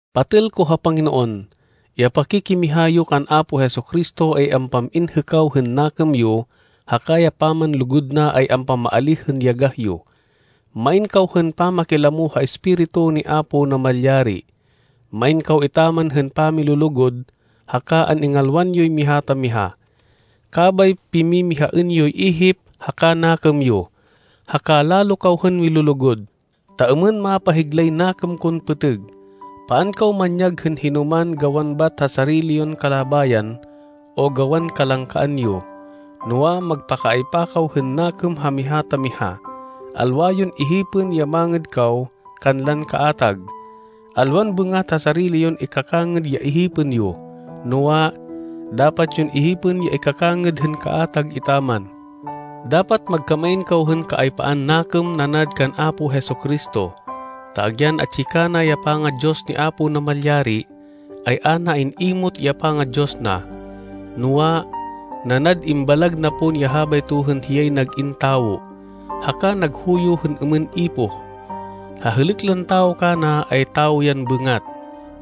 Patêl ko ha Panginoon, ya pakikimiha yo kan Apo Jesu-Cristo ay ampam-in hêkaw hên nakêm yo haka ya pamanlugud na ay ampamaalíh hên yagah yo. Main kaw hên pamakilamo ha Espiritu ni Apo Namalyari. Main kaw etaman hên pamilulugud haka an-ingalwan yoy miha ta miha. Kabay pimimihaên yoy ihip haka nakêm yo. Haka lalo kaw hên milulugud, ta êmên mapahiglay nakêm kon pêtêg. Paan kaw manyag hên hinoman gawan bat ha sarili yon kalabayan, o gawan kalangkaan yo. Noa, magpakaaypa kaw hên nakêm ha miha ta miha. Alwa yon ihipên ya mangêd kaw kanlan kaatag. Alwan bêngat ha sarili yon ikakangêd ya ihipên yo, noa, dapat yon ihipên ya ikakangêd hên kaatag etaman. Dapat magkamain kaw hên kaaypaan nakêm nanad kan Apo Jesu-Cristo, ta agyan atsi kana ya panga-Diyos ni Apo Namalyari, ay a na in-imot ya panga-Diyos na. Noa, nanad imbalag na pon ya habayto hên hiyay nag-in tawo, haka naghuyo hên êmên ipoh. Ha hêlêk lan tawo kana ay tawo yan bêngat.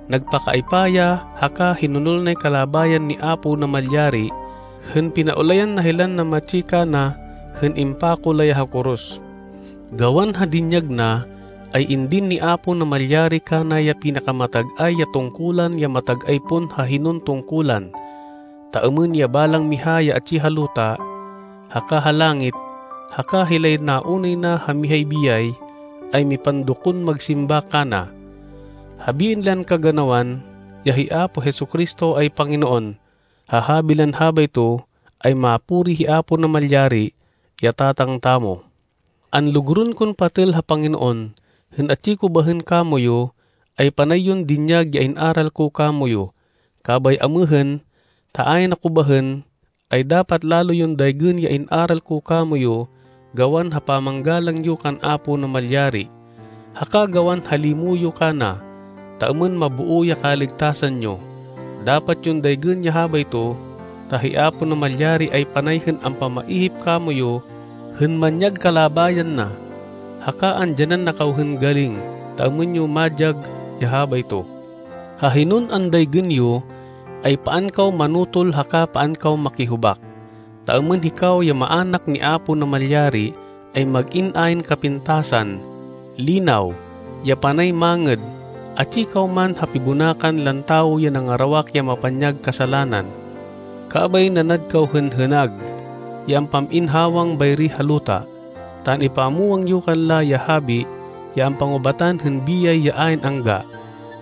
Nagpakaaypa ya haka hinonol nay kalabayan ni Apo Namalyari hên pinaulayan na hilan namatsi kana hên impako la ya ha koros. Gawan ha dinyag na, ay indin ni Apo Namalyari kana ya pinakamatag-ay ya tungkulan ya matag-ay pon ha hinon tungkulan, ta êmên ya balang miha ya atsi ha luta, haka ha langit haka hilay naunay na ha mihay biyay, ay mipandokon magsimba kana. Habiên lan kaganawan, ya hi Apo Jesu-Cristo ay Panginoon. Ha habi lan habayto, ay mapuri hi Apo Namalyari, ya Tatang tamo. Anlugurên kon patêl ha Panginoon, hên atsi ko bahên kamoyu, ay panay yon dinyag ya in-aral ko kamoyu. Kabay amêhên, ta ayn ako bahên, ay dapat lalo yon daygên ya in-aral ko kamoyu gawan ha pamanggalang yo kan Apo Namalyari, haka gawan ha limo yo kana, ta êmên maboo ya kaligtasan yo. Dapat yon daygên ya habayto, ta hi Apo Namalyari ay panay hên ampamaihip kamoyu hên manyag kalabayan na, haka andyanan na kaw hên galing ta êmên yo madyag ya habayto. Ha hinon andaygên yo, ay paan kaw manotol haka paan kaw makihubak, ta êmên hikaw ya maának ni Apo Namalyari ay mag-in ayn kapintasan, línaw, ya panay mangêd, atsi kaw man ha pibonakan lan tawo ya nangarawak ya mapanyag kasalanan. Kabay nanad kaw hên hênag ya ampam-in hawang bayri ha luta, ta an-ipamwang yo kanla ya habi ya ampangubatan hên biyay ya ayn angga,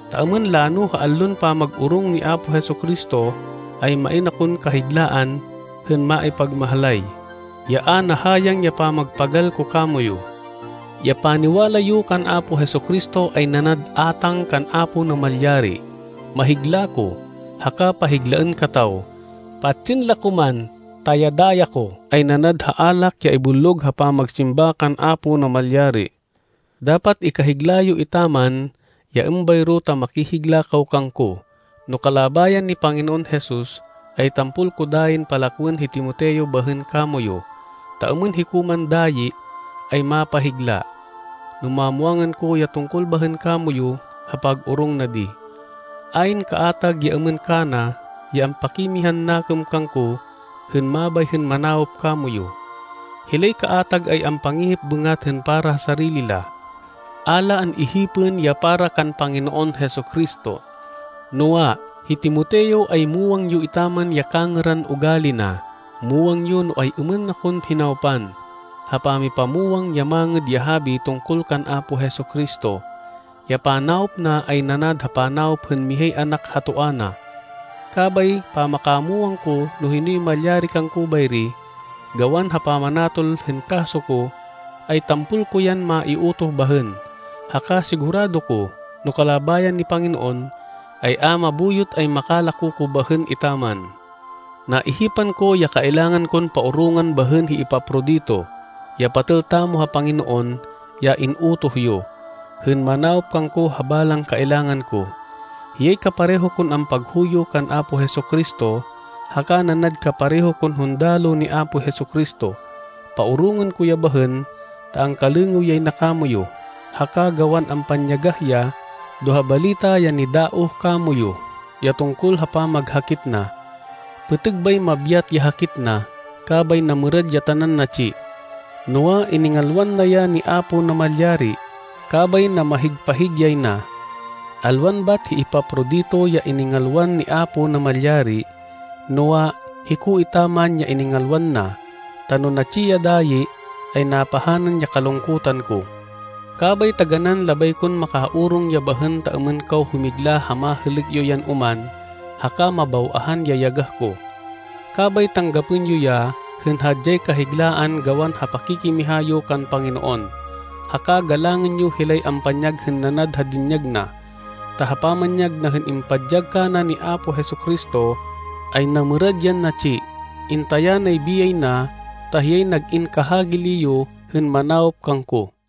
ta êmên lano ha allon pamag-orong ni Apo Jesu-Cristo, ay main akon kahiglaan hên maipagmahlay, ya a nahayang ya pamagpagal ko kamoyu. Ya paniwala yo kan Apo Jesu-Cristo ay nanad átang kan Apo Namalyari. Mahigla ko, haka pahiglaên kataw, patsên la ko man ta ya daya ko ay nanad ha alak ya ibullog ha pamagsimba kan Apo Namalyari. Dapat ikahigla yo etaman ya êmbayro ta makihigla kaw kangko. No kalabayan ni Panginoon Jesus, ay tampol ko dayin palakwên hi Timoteo bahên kamoyu, ta êmên hiko man dayi, ay mapahigla, no mamwangan ko ya tungkol bahên kamoyu ha pag-orong na di. Ayn kaatag ya êmên kana ya ampakimihan nakêm kangko hên mabay hên manawop kamoyu. Hilay kaatag ay ampangihip bêngat hên para ha sarili la. A la an-ihipên ya para kan Panginoon Jesu-Cristo. Noa, hi Timoteo ay muwang yo etaman ya kangêran ugali na. Muwang yo no ay-êmên na kon hinawpan, ha pamipamwang ya Mangêd ya Habi tungkol kan Apo Jesu-Cristo. Ya panawop na ay nanad ha panawop hên mihay anak ha toa na. Kabay pamakamwang ko no hinoy malyari kangko bayri, gawan ha pamanatol hên kaso ko, ay tampol ko yan maiutoh bahên. Haka sigurado ko, no kalabayan ni Panginoon, ay a mabuyot ay makalako ko bahên etaman. Naihipan ko ya kailangan kon paorongên bahên hi Epafrodito, ya patêl tamo ha Panginoon ya in-utoh yo, hên manawop kangko ha balang kailangan ko. Hiyay kapareho kon ampaghuyo kan Apo Jesu-Cristo, haka nanad kapareho kon hundaloh ni Apo Jesu-Cristo. Paorongên ko ya bahên ta angkalêngêw yay na kamoyu, haka gawan ampanyagah ya do ha balita ya nidaoh kamoyu, ya tungkol ha pamaghakit na. Pêtêg bay mabyat ya hakit na, kabay namêrad ya tanan natsi. Noa, iningalwan na ya ni Apo Namalyari, kabay namahig-pahig yay na. Alwan bat hi Epafrodito ya iningalwan ni Apo Namalyari, noa, hiko etaman ya iningalwan na, ta no natsi ya dayi, ay napahanan ya kalungkutan ko. Kabay taganán labay kon makaorong ya bahên ta êmên kaw humigla ha mahêlêk yo yan oman haka mabaw-ahan ya yagah ko. Kabay tanggapên yo ya hên hadyay kahiglaan gawan ha pakikimiha yo kan Panginoon, haka galangên yo hilay ampanyag hên nanad ha dinyag na. Ta ha pamanyag na hên impadyag kana ni Apo Jesu-Cristo, ay namêrad yan natsi. Intaya nay biyay na ta hiyay nag-in kahagili yo hên manawop kangko.